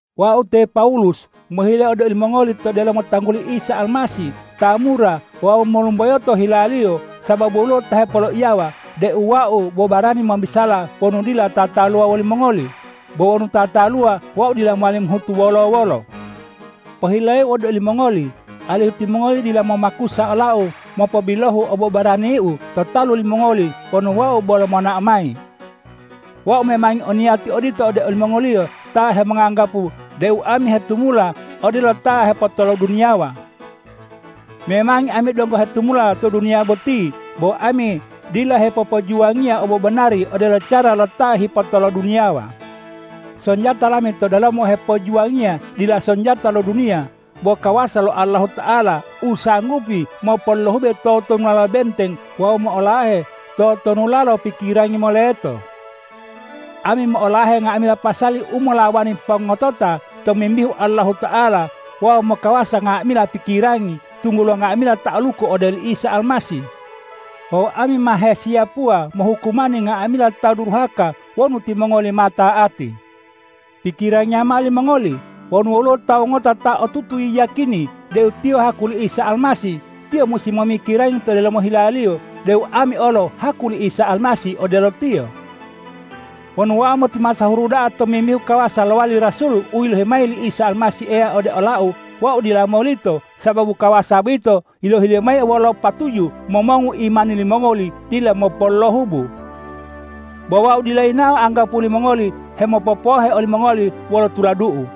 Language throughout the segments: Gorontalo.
Wau te Pawulus mohile ode olimongoli to delomo tangguli Isa Almasih ta mura wawu molumboyo to hila-Liyo sababu woluwo ta hepoloiyawa deu wau bo barani mobisala wonu dila tataluwa wolimongoli, bo wonu tataluwa, wau dila mowali mohutu wolo-wolo. Pohileu ode olimongoli alihu timongoli dila momakusa olau mopobilohu obobaraniu to talu limongoli wonu wau bolo monao mayi. Wau memangi o niyati odito ode olimongoliyo ta hemonganggapu deu ami hetumula odelo ta hepotoloduniyawa. Memangi ami donggo hetumula to duniya boti, bo ami dila hipopojuwangiya obobanari odelo cara lo ta hepotoloduniyawa. Sonjata lami to delomo hepojuwangiya dila sonjata lo duniya, bo kawasa lo Allahuta'ala, u sanggupi mopolohube totonulalo benteng wawu mo'olahe totonulalo pikirangi moleto. Ami mo'olahe nga'amila pasali u molawani pongotota tomimbihu Allahuta'ala wawu mokawasa nga'amila pikirangi, tunggulo nga'amila ta'aluku ode oli Isa Almasih. Wawu ami ma hesiyapuwa mohukumani nga'amila ta duruhaka wonu timongoli ma ta'ati. Pikirangiya mao limongoli! Wonu woluwo tawu ngota ta otutu yiyakini deu tiyo haku li Isa Almasih, tiyo musi momikirangi to delomo hilaliyo deu ami olo haku li Isa Almasih odelo tiyo. Wonu wau motimasahuru da'a tomimbihu kawasa lowali rasul u yilohi mayi li Isa Almasih Eya ode olau, wau dila molito sababu kawasa boyito yilohi-Liyo mayi wolo patuju momongu imani limongoli dila mopolohubu. Bo wau dila yinawo anggapuwo limongoli hemopopohe olimongoli wolo tuladu'u.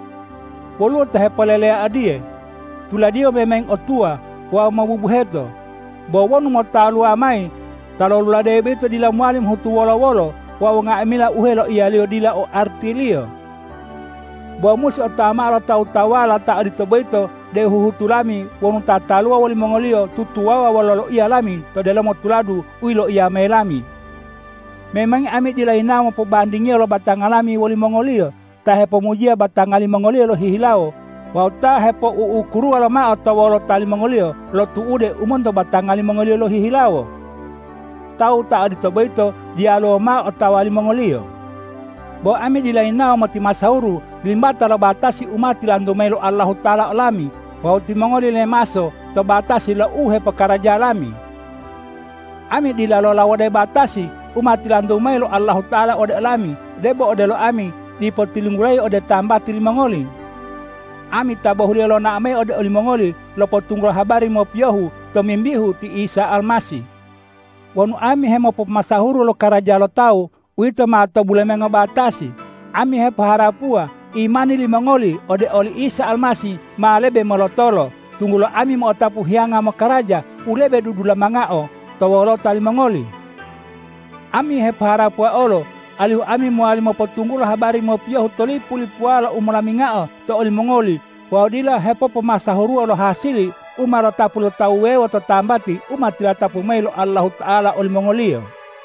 Woluwo ta hepoleleya odiye,”Tuladiyo memangi otuwa wawu mobubuheto. Bo wonu motaluwa mayi, ta loluladeyi boyito dila mowali mohutu wolo-wolo wawu nga'amila u heloiyaliyo dila o artiliyo.” Bo musi otawa mao lo tawu-tawuwala ta odito boyito deu huhutu lami wonu tataluwa wolimongoliyo tutuwawuwa wolo loiya lami to delomo tuladu u yilawo mayi lami. Memangi ami dila yinawo mopobandingiyo lo batanga lami wolimongoliyo ta hepomujiya batanga limongoliyo lohihilawo wawu ta hepou'ukuruwa lomao to wolota limongoliyo lo tu'ude u monto batanga limongoliyo lohihilawo! Tawu ta odito boyito, diyaluwo mao u otawa limongoliyo. Bo ami dila yinawo motimasahuru limbata lo batasi u ma tilantu mayi lo Allahuta'ala olami wawu timongoli lemaso to batasi lo uhepokaraja lami. Ami dila lolawode batasi u ma tilantu mayi lo Allahuta'ala ode olami debo odelo ami dipo tilunggulayi ode tambati limongoli. Ami ta bohuliyo lonao mayi ode olimongoli lopotunggulo habari mopiyohu tomimbihu ti Isa Almasih. Wonu ami hemopomasahuru lokaraja lo tawu, uwito ma to bulemengo batasi. Ami hepoharapuwa imani limongoli ode oli Isa Almasih ma lebe molotolo, tunggulo ami mo'otapu hiyanga mokaraja u lebe dudulamangao to wolota limongoli. Ami hepoharapuwa olo alihu ami mowali mopotunggulo habari mopiyohu to lipu-lipuwala u molamingao to olimongoli wawu dila hepopomasahuruwa lo hasili u ma lotapu lo tawu wuwewo to tambati u ma tilatapu mayi lo Allahuta'ala olimongoliyo.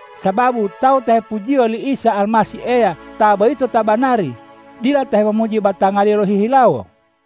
Sababu tawu ta hepujiyo li Isa Almasih Eya, ta boyito ta banari, dila ta hemomuji batangaliyo lohihilawo.